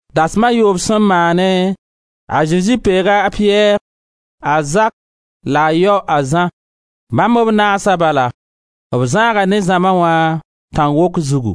Dasem a yoob sẽn maane, a Zezi peega a Piyɛr, a Zak, la a yao, a Zã, bãmb b naasa bala; b zãaga ne zãma wã, tãn-wok zugu.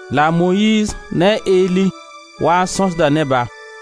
La a Moyiiz ne a Eli waa n sõsda ne-ba.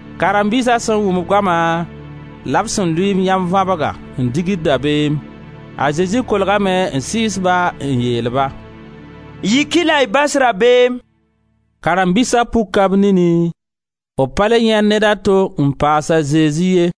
Karen-biisa sẽn wʋm goama la b sẽn lʋɩ b yãnvabga n digd dabeem. A Zezi kolgame n sɩɩs-ba n yeel-ba: «Yik-y la y bas rabeem!» Karen-biisa puka b nini, b pa le yãend neda to n paas a Zezi ye.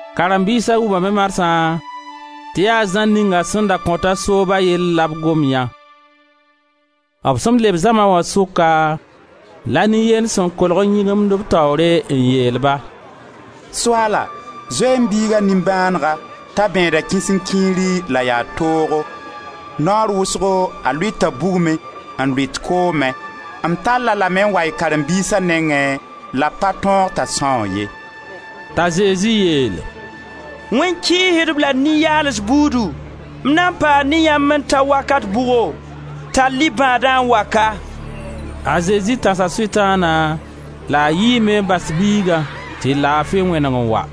Karen-biisa wʋmame marsã tɩ yaa Zã ning sẽn da kõta sooba yell la b gom yã. B sẽn leb zãma wã sʋka la nin-yend sẽn kolg n yĩgimd b taoore n yeel-ba: «Soaala, zoe-y m biiga nimbãanega t'a bẽeda kisenkiiri la yaa toogo. Naoor wʋsgo, a lʋɩta bugmẽ, n lʋɩt koomẽ. M tall-a lame n wa y karen-biisa nengẽ la b pa tõog t'a sãoog ye.» T'a Zezi yeel: «Wẽn-kɩɩsdb la nin-yaals buudu, m na n paa ne yãmb n ta wakat bʋgo? Tall-y bãadã n wa ka!» A Zezi tãsa Sʋtãana la a yiime n bas biigã tɩ laafi wẽneg n wa.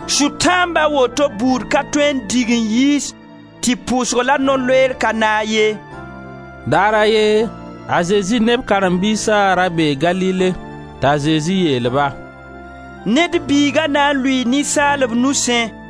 Sʋtãamb a woto buud ka tõe n dig n yiis tɩ pʋʋsg la no-loeer ka naag ye.]» Daar a ye, a Zezi ne b karen-biisa ra bee Galile t'a Zezi yeel-ba: «Ned Biiga na n lʋɩɩ ninsaalb nusẽ,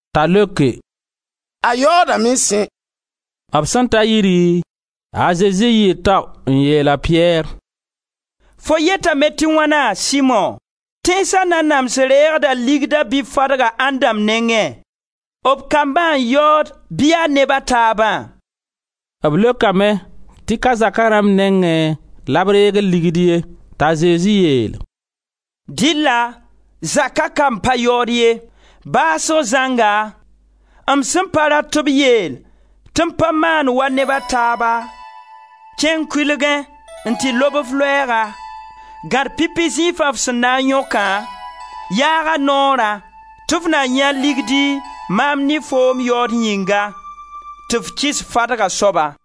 T'a leoke: «A yaoodame sẽ!» B sẽn ta yiri, a Zezi yɩɩ tao n yeel a Piyɛr: «Fo yetame tɩ wãna, Simo? Tẽnsa nanams reegda ligda bɩ fadgã ãnd dãmb nengẽ: b kambã n yaood bɩ yaa neb a taabã?» B leokame tɩ ka b zaka rãmb nengẽ la b reegd ligd ye. T'a Zezi yeel: «Dɩlla zaka kamb pa yaood ye. Baasg zãnga, m sẽn pa rat tɩ b yeel tɩ m pa maand wa neb a taaba, kẽng kʋɩlgẽ n tɩ lob f loɛɛga; gãd pipi zĩifã f sẽn na n yõkã, yaag a noorã tɩ f na yãe ligdi maam ne foom yaood yĩnga, tɩ f kɩs fadg a soaba.»